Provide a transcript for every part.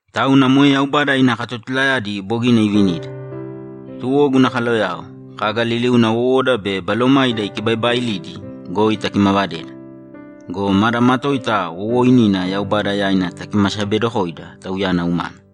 Tauna moe Yaubada ina katotulayadi bogina ivinida, tuwo guna kaloyao, kaga liliuna wowoda be balomaida ikibaibaailidi goi takimavadēda go, mada matoita wowooinina Yaubada yaina takimasabedokōida Tauyana umana.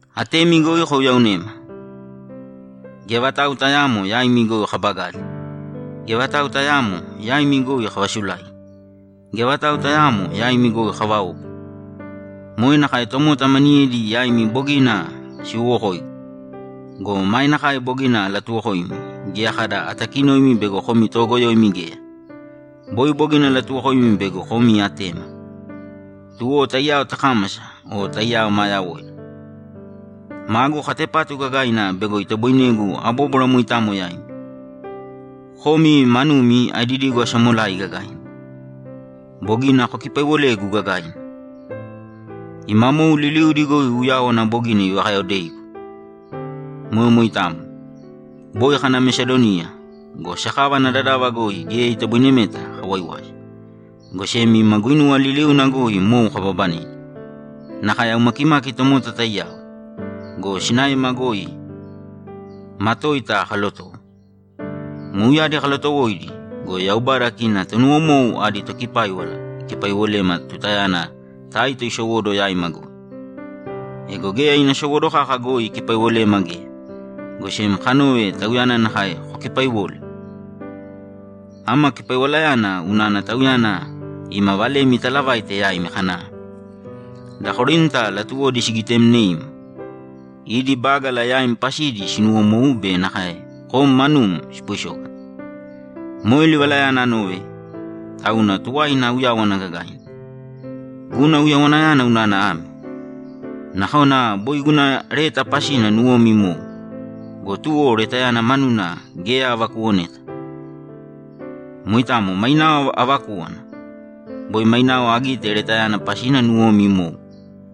Atemi goi kouyaonēma! Geya vatau tayaamo yaimi goi kabagali. Geya vatau tayaamo yaimi goi kavasulaigi. Geya vatau tayaamo yaimi goi kavaobu. Moe nakae tomota maniyedi yaimi bogina siwowokoigu go, mae nakae bogina alatuwokoimi geya kada atakinoimi bego komi toogoyoimi geya. Boi bogina alatuwokoimi bego komi atema, tuwo taiyao takámasa o taiyao maa yawoida. Magu katepatu gagaina bego itoboinegu abóbwara moitamo yaimi. Komi manumi aedidigu asamolai gagaina. Bogina kokipaiwolegu gagaina. Ima mou liliudi goi uyáwana bogina ivakayaodeigu. Moe moitamo. Boi kana Mesadoniya go, sakava ana dadava goi geya itoboinemeta kawaiwasi, go sem ima guinuwa liliuna goi mou kababanedi, nakae aumakimaki tomota taiyao go, sinaema goi matoita kalotowo. Mouyadi kalotowoidi go, Yaubada kina tonuwomou adi Tokipáiwala ikipaiwolema tutayana Taito isowóduwo yaima goi. Ego geya ina sowóduwo kaka goi ikipaiwolema geya, go sem kanove tauyana nakae kokipaiwole. Ama kipaiwalayana unana tauyana ima valemi italavaite yaima kana, ‘Da Korinta latuwodi sigitemneim, idi bágala yaim pasidi sinuwomou be nakae kom manum sipoisógana.’ Moe livalayana anove, tauna tuwaina auyáwana gagaina. Guna uyawanayana unana ame: Nakona boi guna leta pasina nuwomi imou go, tuwo letayana manuna geya avakuwoneta. Moitamo mainao avakúwana. Boi mainao agite letayana pasina nuwomi imou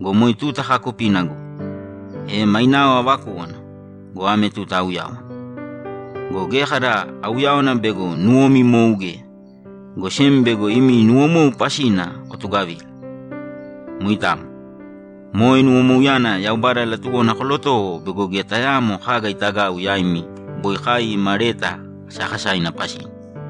go, moe tuta kaakupina goi. E mainao avakúwana go, ame tuta auyáwana. Go geya kada auyáwana bego nuwomi imou geya, go sem bego imi nuwomou pasina kotugavila. Moitamo. Moe nuwomouyana Yaubada latuwona kolotowo bego geya tayaamo kaga itagau yaimi boi kai ima leta kasakasaina pasina.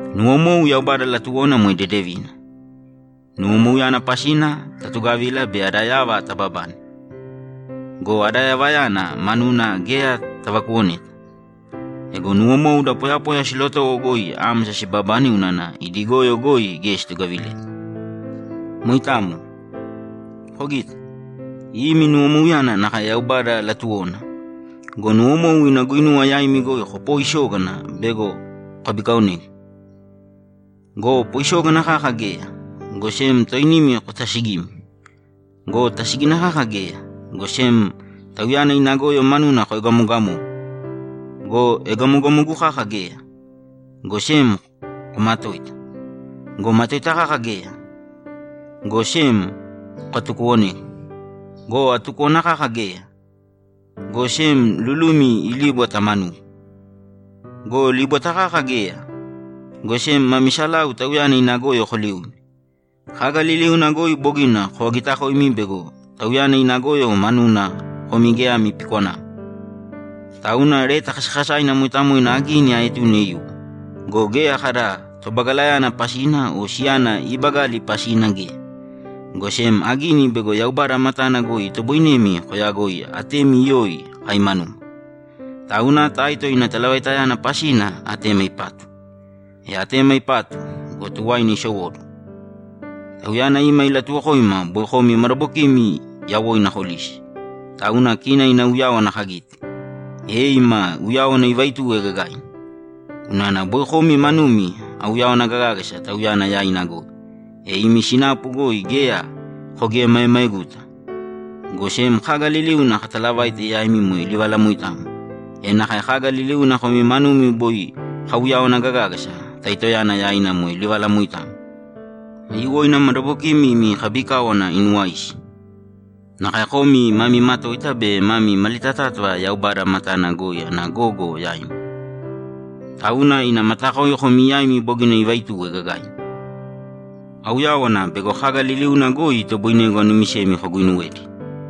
Nuwomou Yaubada latuwona moe dedevina. Nuwomouyana pasina tatugavila bei ada yava tababane. Go ada yavayana manuna geya tavakuwoneta. Ego nuwomou da poyapoya silotowo goi ámasa sibabane unana idi goyo goi geya situgavileta. Moitamo. Kogita? Imi nuwomouyana nakae Yaubada latuwona go, nuwomou ina guinuwa yaimi goi kopoisógana bego kokabikaonegu. Go poisógana kaka geya, go sem toinimi kotasigimi. Go tasígina kaka geya, go sem tauyana ina goyo manuna koegamogamogu. Go egamogamogu kaka geya, go sem komatoita. Go matoita kaka geya, go sem kokatukuwonegu. Go atukúwana kaka geya, go sem lulumi ilíbwata manugu. Go líbwata kaka geya, go sem mami salau tauyana ina goyo koliune. Kaga liliuna goi bogina kovagitakoimi bego tauyana ina goyo manuna komi geya ami pikwanamo. Tauna leta kasakasaina moitamo agini aetune iwo go, geya kada tobagalayana pasina o siyana iibagali pasina geya, go sem agini bego Yaubada matana goi itoboinemi koyagoi atemi iyoi kai manuma. Tauna Taito ina talavaitayana pasina atema ipatu. E atema ipatu go, tuwaina isowóduwo. Tauyana ima ilatuwokoima boi komi madabokimi yawoina kolisi. Tauna kina ina uyáwana kagite, e ima uyáwana ivaituwe gagaina. Unana boi komi manumi auyawana gagágasa tauyana yaina goi, e imi sinapu goi geya kogiemaemaeguta, go sem kaga liliuna katalavaite yaimi moe livala moitamo, e nakae kaga liliuna komi manumi boi kauyawana gagágasa Taitoyana yaina moe livala moitamo. Aiyuwoina madabokimi imi kabikáwana inuwaisi. Nakae komi mami matoita be mami malitatátava Yaubada matana goi ana gogo yaimi. Tauna ina matakoi komi yaimi bogina ivaituwe gagaina. Auyáwana bego kaga liliuna goi itoboinegu anumisemi koguinuwedi.